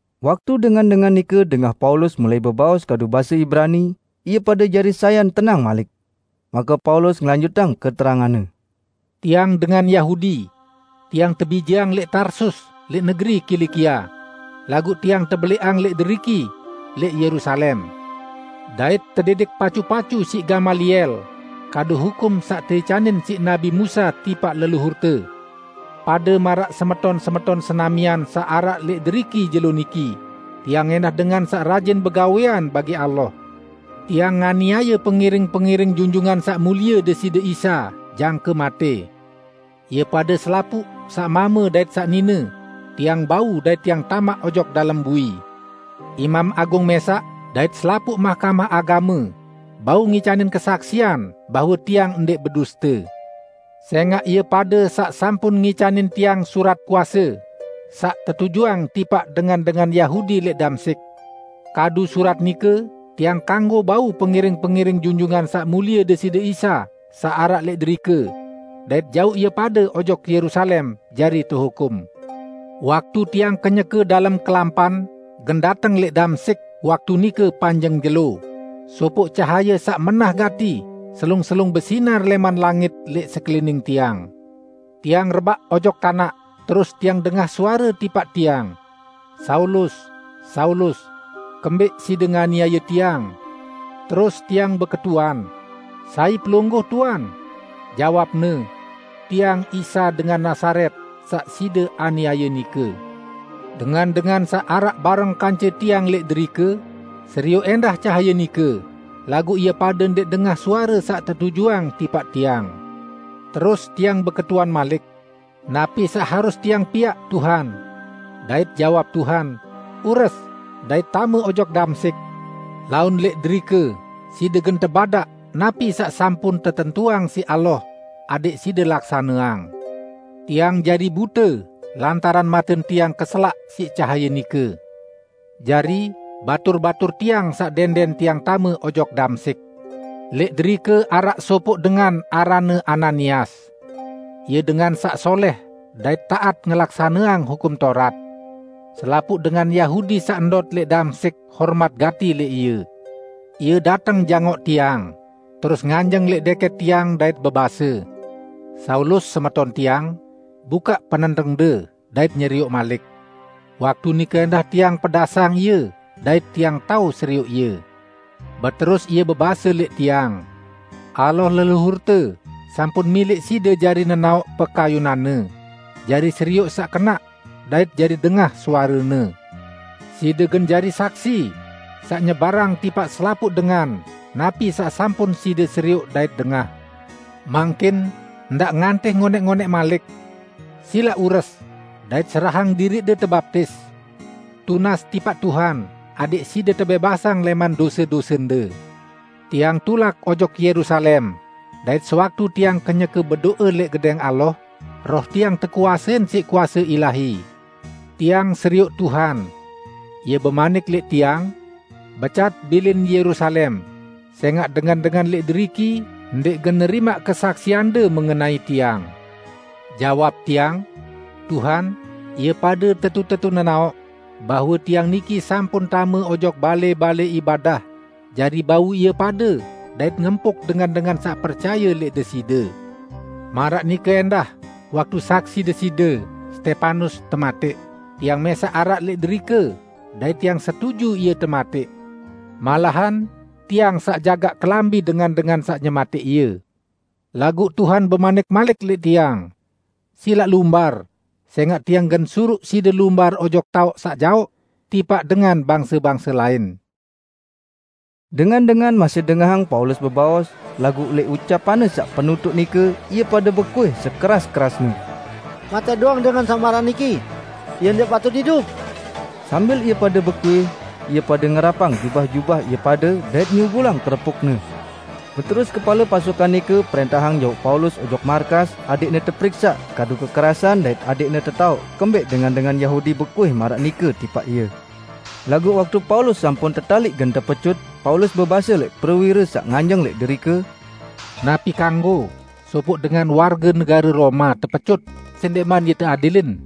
Waktu dengan-dengan nike dengah Paulus mulai bebaos kadu base Ibrani, ie pade jari sayan tenang malik. Make Paulus ngelanjutang keteranganne. "Tiang dengan Yahudi, Tiang tebijeang lẽq Tarsus lẽq negeri Kilikia, laguq tiang tebelẽqang lẽq deriki lẽq Yerusalem, dait tedidik pacu-pacu siq Gamaliel kadu hukum saq teicanin siq nabi Musa tipaq leluhurte. Pade maraq semeton-semeton senamian saq araq lẽq deriki jelo niki, tiang ẽndah dengan saq rajin begawẽan bagi Allah. Tiang nganiaye pengiring-pengiring Junjungan Saq Mulie Deside Isa jangke matẽ. Ie pade selapuq saq mame dait saq nine, tiang bau dait tiang tamaq ojok dalem bui. Imam Agung mẽsaq dait selapuq Mahkamah Agame bau ngicanin kesaksian bahwe tiang ndẽq beduste. Sẽngaq ie pade saq sampun ngicanin tiang surat kuase saq tetujuang tipaq dengan-dengan Yahudi lẽq Damsyik. Kadu surat nike tiang kanggo bau pengiring-pengiring Junjungan Saq Mulie Deside Isa saq araq lẽq derike, dait jauq ie pade ojok Yerusalem jari tehukum." "Waktu tiang kenyeke dalem kelampan gen dateng lẽq Damsyik waktu nike panjeng jelo, sopoq cahaye saq menah gati selung-selung besinar lẽman langit lẽq sekelining tiang. Tiang rebaq ojok tanaq, terus tiang dengah suare tipaq tiang, 'Saulus, Saulus! Kembẽq side nganiaye Tiang?' Terus tiang beketuan, 'Sai Pelungguh, Tuan?' Jawab-Ne, 'Tiang Isa dengan Nazaret saq side aniaye nike.' Dengan-dengan saq araq bareng kance tiang lẽq derike serioq ẽndah cahaye nike, laguq ie pade ndẽq dengah suare saq tetujuang tipaq tiang. Terus tiang beketuan malik, 'Napi saq harus tiang piaq, Tuhan?' Dait jawab Tuhan, 'Ures, dait tame ojok Damsyik. Laun lẽq derike side gen tebadaq napi saq sampun tetentuang siq Allah side laksaneang.' Tiang jari bute lantaran maten tiang keselaq siq cahaye nike. Jari batur-batur tiang saq dẽndẽn tiang tame ojok Damsyik. Lẽq derike araq sopoq dengan aranne Ananias. Ie dengan saq solẽh dait taat ngelaksaneang Hukum Taurat. Selapuq dengan Yahudi saq ndot lẽq Damsyik hormat gati lẽq ie. Ie dateng jangoq tiang, terus nganjeng lẽq dẽkẽt tiang dait bebase, 'Saulus semeton tiang, bukaq penentengde dait nyerioq malik!' Waktu nike ẽndah tiang pedasang ie dait tiang tao serioq ie. Beterus ie bebase lẽq tiang, 'Allah leluhurte sampun milẽq side jari nenaoq pekayunan-Ne, jari serioq Saq Kenaq, dait jari dengah suare-Ne. Side gen jari saksi saq nyebarang tipaq selapuq dengan napi saq sampun side serioq dait dengah. Mangkin ndaq ngantih ngonẽq-ngonẽq malik. Silaq ures, dait serahang diriqde tebaptis. Tunas tipaq Tuhan adẽq side tebẽbasang lẽman dose-dosende.' " "Tiang tulak ojok Yerusalem, dait sewaktu tiang kenyeke bedo'e lẽq Gedẽng Allah, roh tiang tekuasein siq kuase ilahi. Tiang serioq Tuhan; Ie bemanik lẽq tiang, 'Becat bilin Yerusalem, sẽngaq dengan-dengan lẽq deriki ndẽq gen nerimaq kesaksiande mengenai Tiang.' Jawab tiang, 'Tuhan, ie pade tetu-tetu nenaoq bahwe tiang niki sampun tame ojok balẽ-balẽ ibadah jari bau ie pade dait ngempuk dengan-dengan saq percaye lẽq Deside. Maraq nike ẽndah waktu saksi Deside Stepanus tematẽq, tiang mẽsaq araq lẽq derike dait tiang setuju ie tematẽq. Malahan tiang saq jagaq kelambi dengan-dengan saq nyematẽq ie.' Laguq Tuhan bemanik malik lẽq tiang, 'Silaq lumbar, sẽngaq Tiang gen suruq side lumbar ojok taoq saq jaoq, tipaq dengan bangse-bangse lain.' " Dengan-dengan masih dengahang Paulus bebaos, laguq lẽq ucapanne saq penutuq nike ie pade bekuih sekeras-kerasne, "Matẽq doang dengan saq maraq niki! Ie ndẽq patut idup!" Sambil ie pade bekuih, ie pade ngerapang jubah-jubah ie pade, dait nyugulang kerepukne. Beterus kepale pasukan nike prẽntahang jauq Paulus ojok markas adẽqne teperiksaq kadu kekerasan dait adẽqne tetaoq kembẽq dengan-dengan Yahudi bekuih maraq nike tipaq ie. Laguq waktu Paulus sampun tetaliq gen tepecut, Paulus bebase lẽq prewire saq nganjeng lẽq derike, "Napi kanggo sopoq dengan warge negare Roma tepecut sendẽqman ie teadilin?"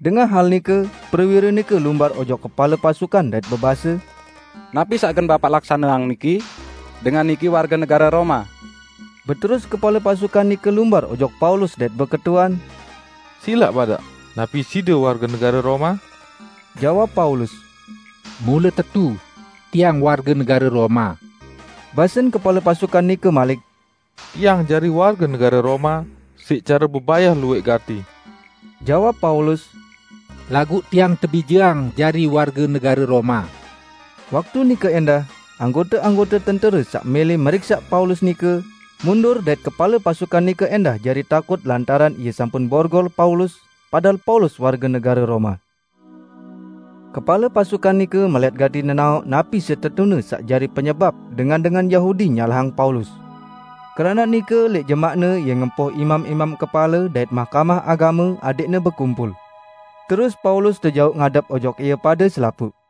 Dengah hal nike, prewire nike lumbar ojok kepale pasukan dait bebase, "Napi saq gen bapaq laksaneang niki? Dengan niki warge negare Roma!" Beterus kepale pasukan nike lumbar ojok Paulus dait beketuan, "Silaq badaq, napi side warge negare Roma?" Jawab Paulus, "Mule tetu, tiang warge negare Roma." Basen kepale pasukan nike malik, "Tiang jari warge negare Roma siq care bebayah luwẽq gati!" Jawab Paulus, "Laguq tiang tebijeang jari warge negare Roma." Waktu nike ẽndah, anggote-anggote tentere saq mẽlẽ meriksaq Paulus nike, mundur dait kepale pasukan nike ẽndah jari takut lantaran ie sampun borgol Paulus, padahal Paulus warge negare Roma. Kepale pasukan nike melẽt gati nenaoq napi setetune saq jari penyebap dengan-dengan Yahudi nyalahang Paulus. Keranaq nike lẽq jemaqne ie ngempoh imam-imam kepale dait Mahkamah Agame adẽqne bekumpul. Terus Paulus tejauq ngadep ojok ie pade selapuq.